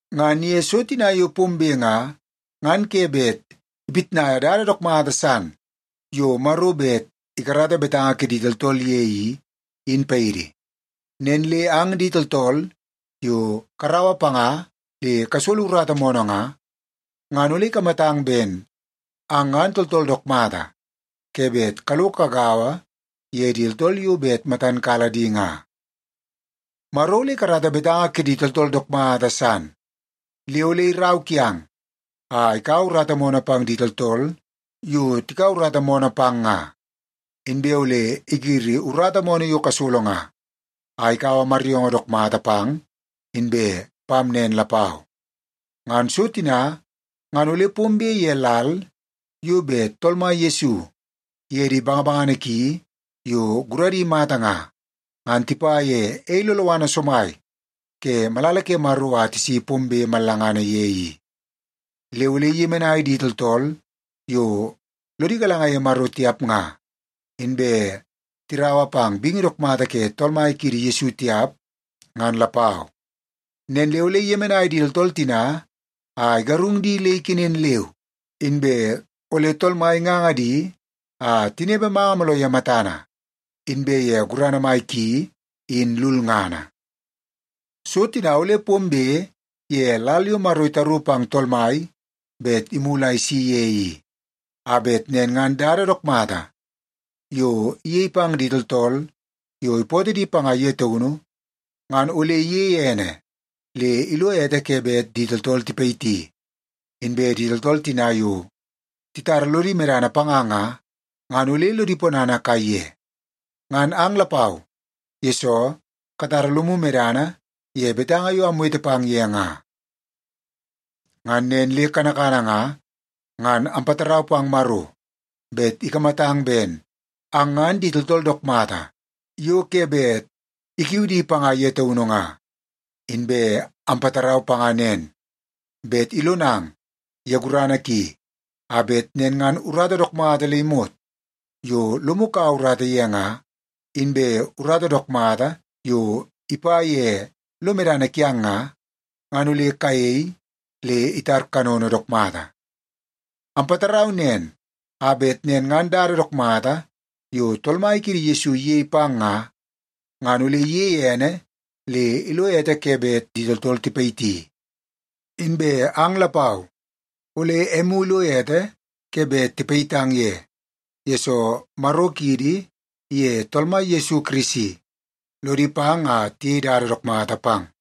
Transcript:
Ngan ye so tina yo pombe nga, ngan ke bet ipitnaia dada dook mata san yo Maro bet ikarata betanga kidi tooltool ye i, in paidi. Nen le ang di tooltool yo karaua panga le kasolo urata moonoo nga, ngan ole ikamatang ben ang ngan tooltool dook mata ke bet kalo kagaua ye di tooltool yo bet matan kala di nga. Maro ole ikarata betanga kidi tooltool dook mata san. Le ole irau kiang a ikaua urata moonoo pang di tooltool yo tikaua urata moonoo pang nga. Inbe ole igiri urata moonoo yo kasolo nga, a ikaua maryoongoo dook mata pang inbe pam nen lapau. Ngan so tina ngan ole pombe ye lal yo bet Tool Mai Yesu iye di bangabangana ki yo guradi mata nga, ngan tipa ye ei loloana somai ke malala ke Maro a tisi pombe mallangana ye i. Le ole iyemenai di tooltool yo lodi galanga ye Maro tiap nga, inbe tiraua pang bingi dook mata ke Tool Mai kiidi Yesu tiap ngan lapau. Nen le ole iyemenai di tooltool tina a igarung di le ikenen leu, inbe ole Tool Mai inganga di a tinepe manga mooloo ye matana inbe ye gurana mai ki in lulngana. So tina ole pombe ye lal yo Maro itaru pang Tool Mai bet imulu a isi ye i, a bet nen ngan dada dook mata yo iyei pang di tooltool yo ipootoo di panga ye taunu ngan ole iyeie ene le ilo ete ke bet di tooltool tipayiti, inbe di tooltool tina yo titara lodi medana panga nga, ngan ole lodi ponana kaiye. Ngan ang lapau, yesoo katara lomu medana ye betanga yo amwete pang ye nga. Ngan nen le kanakana nga, ngan ampatarau pang Maro bet ikamatang ben ang di tooltool dook mata yo ke bet ikiu di panga ye taunu nga. Inbe ampatarau panga nen, bet ilonang ye gurana ki a bet nen ngan urata dook mata le imot yo lomu kaua urata ye nga, inbe urata dook mata yo ipa ye lo medana kiang nga, ngan ole kayei le itar kanono dook mata. Ampatarau nen a bet nen ngan dada dook mata yo Tool Mai kiidi Yesu iyei pang nga, ngan ole iyeie ene le ilo ete ke bet di tooltool tipayiti. Inbe ang lapau, ole emu ilo ete ke bet ipayitang ye, yesoo Maro kiidi iye Tool Mai Yesu Kirisi lodi pang a tiyei dada dook mata pang.